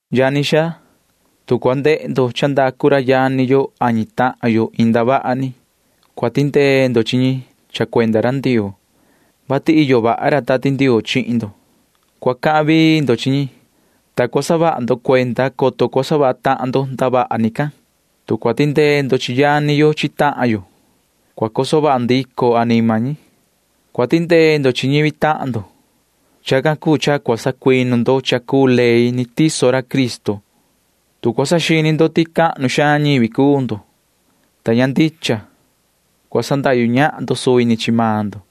Yani xaa, tu cua ndehe ndo cha ndacu ra yani yo ñi tahan yo iin ndavaha ni, cua tindee ndo chi ñi cha cuenda ra Ndioo, vati iyo vaha ra Tati Ndioo chihin ndo. Cua cahan vii ndo chi ñi, soco cua saha vaha ndo cuenda, coto cua savaha tahan ndo ndavaha ni can. Tu cua tindee ndo chi yani yo chi tahan yo, cua coso vaha ndico anima ñi. Cua tindee ndo chi ñivi tahan ndo, ta tacan ni cua sacuinu ndo cha cuu ley ni tiso ra Cristo. Tu cua saxini ndo ti cahnu xaan ñivi cuu ndo, ta ña ndicha, cua sandahyu ñahan ndo suvi ni chi maan ndo.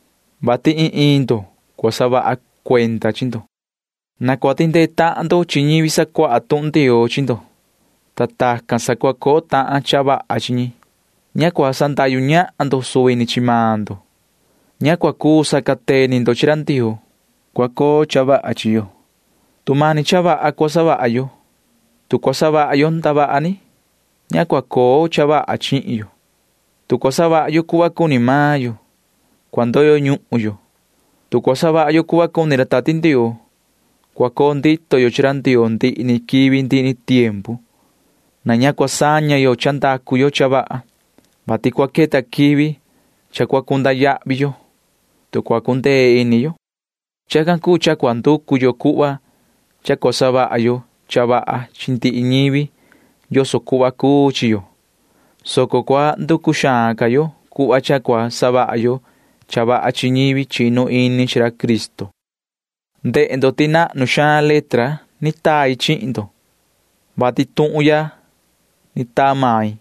Tacan ni ndihi ndo cua saha ndo cuenda cha cuu chi maan ndo. Na cua tindee tahan ndo chi ñivi sacuaha tuhun Ndioo chi ndo, ta tacan sa cua coo tahan cha vaha chi ñi. Ña cua sandahyu ñahan ndo chi ndo. Ña cua cuu sacateni ndo chi ra Ndioo. Cua coo cha vaha chi yo, tu mani cha vaha cua savaha yo. Tu cua savaha yo ndavaha ni, ña cua coo cha vaha chihin yo. Tu cua savaha yo cuhva cuni maan yo, cua ndoyo ñuhun yo. Tu cua savaha yo cuhva cuni ra Tati Ndioo, cua coo ndito yo chi ra Ndioo ndihi ni quivi ndihi ni tiempu. Na ña cua saña yo cha ndacu yo cha vaha, vati cua queta quivi cha cua cunda yahvi yo, tu cua cundee ini yo. Chacan cuu cha cua nducu yo cuhva cha cua savaha yo cha vaha chi ndihi ñivi yoso cuhva cuu chi yo, soco cua nducu xaan ca yo cuhva cha cua savaha yo cha vaha chi ñivi chinu ini chi ra Cristo. Ndehe ndo ti nahnu xaan letra ni tai chihin ndo, vati tuhun ya ni taa main.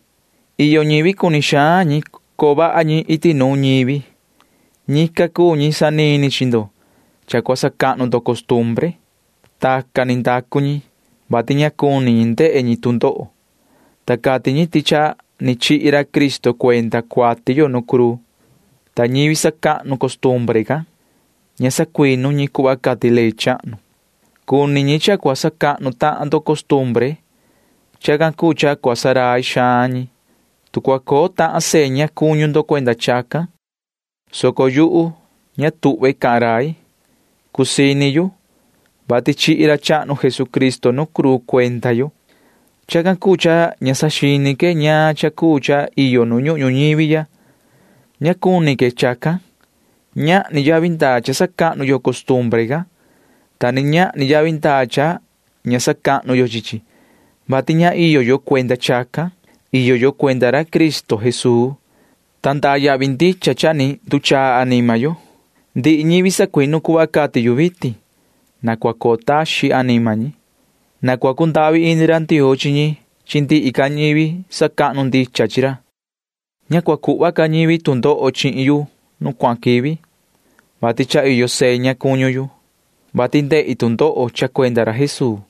Iyo ñivi cuni xaan ñi coo vaha ñi iti nuun ñivi. Ñican cuu ñi sanini chi ndo cha cua sacahnu ndo costumbre. Tacan ni savaha ñi, vati ña cuni ñi ndehe ñi tu ndoho, ta cati ñi ti cha ni chihi ra Cristo cuenda cuati yo nu cruu. Ta ñivi sacahnu costumbre can―ña sacuinu ñi cuhva cati ley chahnu. Cuni ñi cha cua sacahnu tahan ndo costumbre. Chacan cuu cha cua ndurai ñi, tu cua coo tahan seña cuñu ndo cuenda chacan, soco ña tuhva main cahan rai yu. Cusii ini yu, vati chihi ra chahnu Jesucristo nu cruu cuenda yo. Chacan cuu cha ña saxini que ñaan cha cuu cha iyo nu ñuhun ñuñivi ya. Ña cuni que chacan. Ñahni yavi ndaa cha sacahnu yo costumbre can, ta ni ñahni yavi ndaa cha ña sacahnu yo chi chi, vati ña iyo yo cuenda chacan. Iyo yo cuenda ra Cristo Jesuu, ta iyo yavi ndaa ndicha cha ni nduchaa anima yo. Ndihi ñivi sacuinu cuhva cati yu vitin―na cua coo taxin anima ñi. Na cua cundahvi ini ra Ndioo chi ñi chi ndihi ca ñivi sacahnu ndicha chi ra. Na ña cua cuhva ca ñivi tu ndoho chihin yu nu cuahan quivi, vati iyo seña cuñu yu, vati ni ndehi tu ndoho cha cuenda ra Jesuu.